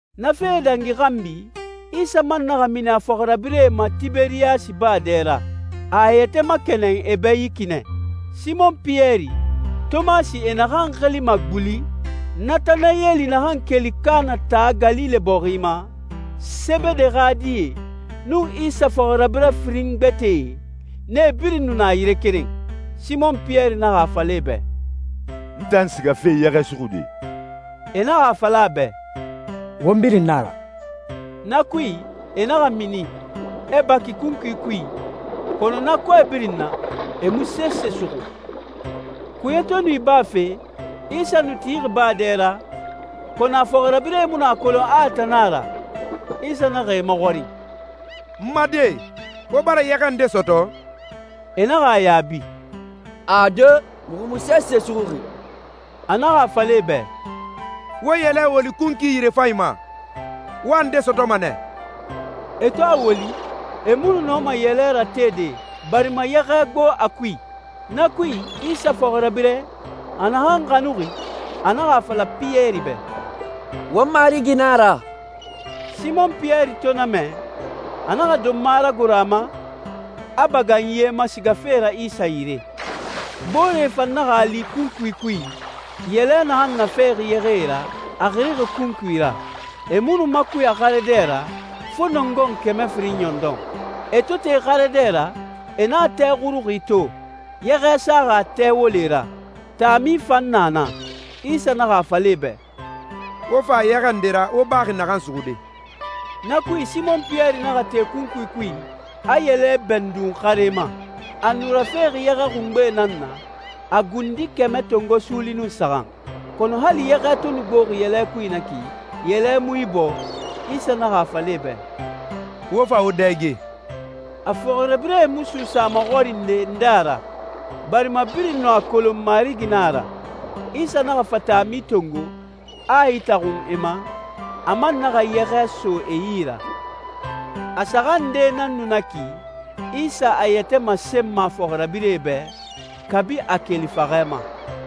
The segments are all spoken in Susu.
Na fee dangi xanbi, Isa man naxa mini a fɔxirabirɛe ma Tiberiyasi baa dɛ ra. A a yɛtɛ makɛnɛn e bɛ yi ki nɛ. Simɔn Piyɛri, Tomasi e naxan xilima «guli,» Natanayɛli naxan keli Kaana taa Galile bɔxi ma, Sebede xa die, nun Isa fɔxirabirɛ firin gbɛtɛe, nee birin nu na yire keren. Simɔn Piyɛri naxa a fala e bɛ, «N tan sigafe yɛxɛ suxude.» E naxa a fala a bɛ, «Won birin na a ra.» Na kui, e naxa mini, e baki kunkui kui, kɔnɔ na kɔɛ birin na, e mu sese suxu. Kuye to nu ibafe, Isa nu tixi baa dɛ ra, kɔnɔ a fɔxirabirɛe mu nu a kolon a a tan nan a ra. Isa naxa e maxɔrin, «N ma die, wo bara yɛxɛ nde sɔtɔ?» E naxa a yaabi, «Ade, muxu mu sese suxuxi.» A naxa a fala e bɛ, «Wo yɛlɛ woli kunkui yirefanyi ma, wo a nde sɔtɔma nɛ.» E to a woli, e mu nu nɔma yɛlɛ ratede, barima yɛxɛ gbo a kui. Na kui, Isa fɔxirabirɛ, a naxan xanuxi, a naxa a fala Piyɛri bɛ, «Won Marigi na a ra.» Simɔn Piyɛri to na mɛ, a naxa donma ragoro a ma, a bagan ye ma sigafe ra Isa yire. Booree fan naxa a li kunkui kui, yɛlɛ naxan nafexi yɛxɛe ra, a xirixi kunkui ra. E mu nu makuya xare dɛ ra, fo nɔngɔn kɛmɛ firin ɲɔndɔn. E to te xare dɛ ra, e naxa tɛ xuruxi to, yɛxɛ saxi a tɛ wole ra, taami fan na na. Isa naxa a fala e bɛ, «Wo fa yɛxɛ nde ra wo baxi naxan suxude.» Na kui Simɔn Piyɛri naxa te kunkui kui, a yɛlɛ bɛndun xare ma. A nu rafexi yɛxɛ xungbee nan na, a gundi kɛmɛ tongo suuli nun saxan. Kɔnɔ hali yɛxɛ to nu gboxi yɛlɛ kui na ki, yɛlɛ mu ibɔɔ. Isa naxa a fala e bɛ, «Wo fa wo dɛge.» A fɔxirabirɛe mu suusa a maxɔrinde nde a ra, barima birin nu a kolon Marigi nan a ra. Isa naxa fa taami tongo, a a itaxun e ma, a man naxa yɛxɛ so e yi ra. A saxan nde nan nu na ki, Isa a yɛtɛ masenma a fɔxirabirɛe bɛ, kabi a keli faxɛ ma.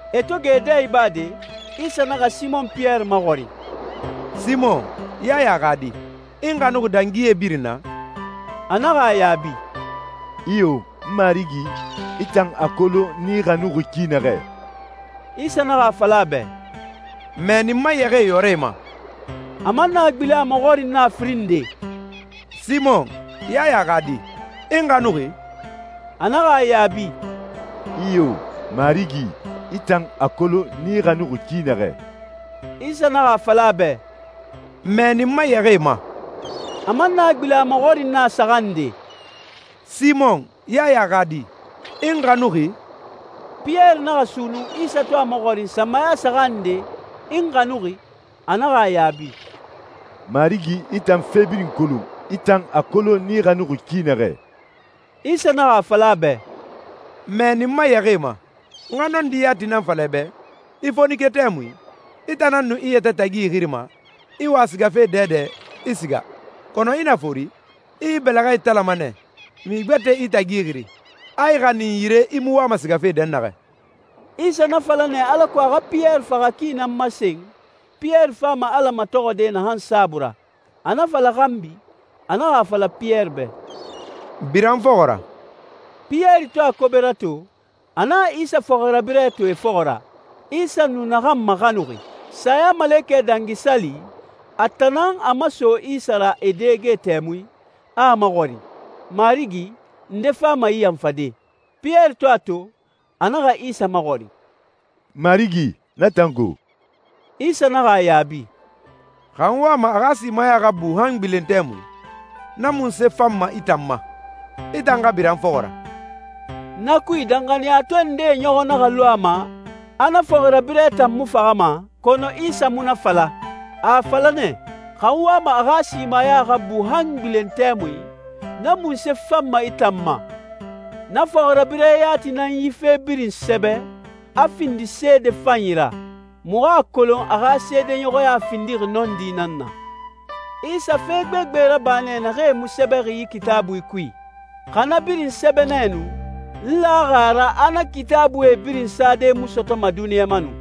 E to gɛ e dɛ ibade, Isa naxa Simɔn Piyɛri maxɔrin, «Simɔn, Yaya xa di, i n xanuxi dangi yee birin na?» A naxa a yaabi, «Iyo, Marigi. I tan a kolon n i xanuxi ki naxɛ.» Isa naxa a fala a bɛ, «Mɛɛni n ma yɛxɛɛ yɔrɛe ma.» A man naxa gbilen a maxɔrin na a firin nde, «Simɔn, Yaya xa di, i n xanuxi?» A naxa a yaabi, «Iyo, Marigi. I tan a kolon n i xanuxi ki naxɛ.» Isa naxa a fala a bɛ, «Mɛɛni n ma yɛxɛɛe ma.» A man naxa gbilen a maxɔrin na a saxan nde, «Simɔn, Yaya xa di, i n xanuxi?» Piyɛri naxa sunnun Isa to a maxɔrin sanmaya saxan nde, «I n xanuxi?» A naxa a yaabi, «Marigi, i tan fe birin kolon. I tan a kolon n i xanuxi ki naxɛ.» Isa naxa a fala a bɛ, «Mɛɛni n ma yɛxɛɛe ma. N xa nɔndi yati nan fala i bɛ, i fonike tɛmui, i tan nan nu i yɛtɛ tagi ixirima, i wa sigafe dɛdɛ, i siga. Kɔnɔ i na fori, i i bɛlɛxɛ italama nɛ, mixi gbɛtɛ i tagi xiri, a i xanin yire i mu wama sigafe dɛnnaxɛ.» Isa na fala nɛ alako a xa Piyɛri faxa ki nan masen, Piyɛri fama Ala matɔxɔde naxan saabui ra. A na fala xanbi, a naxa a fala Piyɛri bɛ, «Bira n fɔxɔ ra.» Piyɛri to a kobe rato, a naxa Isa fɔxirabirɛ to e fɔxɔ ra, Isa nu naxan maxanuxi. Sayamalekɛ Dangi Sali, a tan nan a maso Isa ra e dɛge tɛmui, a a maxɔrin, «Marigi, nde fama i yanfade?» Piyɛri to a to, a naxa Isa maxɔrin, «Marigi, na tan go?» Isa naxa a yaabi, «Xa n wama a xa simaya xa bu han n gbilen tɛmui, na munse fanma i tan ma? I tan xa bira n fɔxɔ ra.» Na kui, danxaniyatɔɛ ndee ɲɔxɔ naxa lu a ma a na fɔxirabirɛ tan mu faxama, kɔnɔ Isa mu na fala. A a fala nɛ, «Xa n wama a xa simaya xa bu han n gbilen tɛmui, na munse fanma i tan ma?» Na fɔxirabirɛ yati nan yi fe birin sɛbɛ, a findi seede fanyi ra. Muxu a kolon a xa seedeɲɔxɔya findixi nɔndi nan na. Isa fe gbegbe raba nɛ naxee mu sɛbɛxi yi Kitaabui kui. Xa na birin sɛbɛ nɛ nu, n laxi a ra a na Kitaabuie birin sade mu sɔtɔma duniɲa ma nu.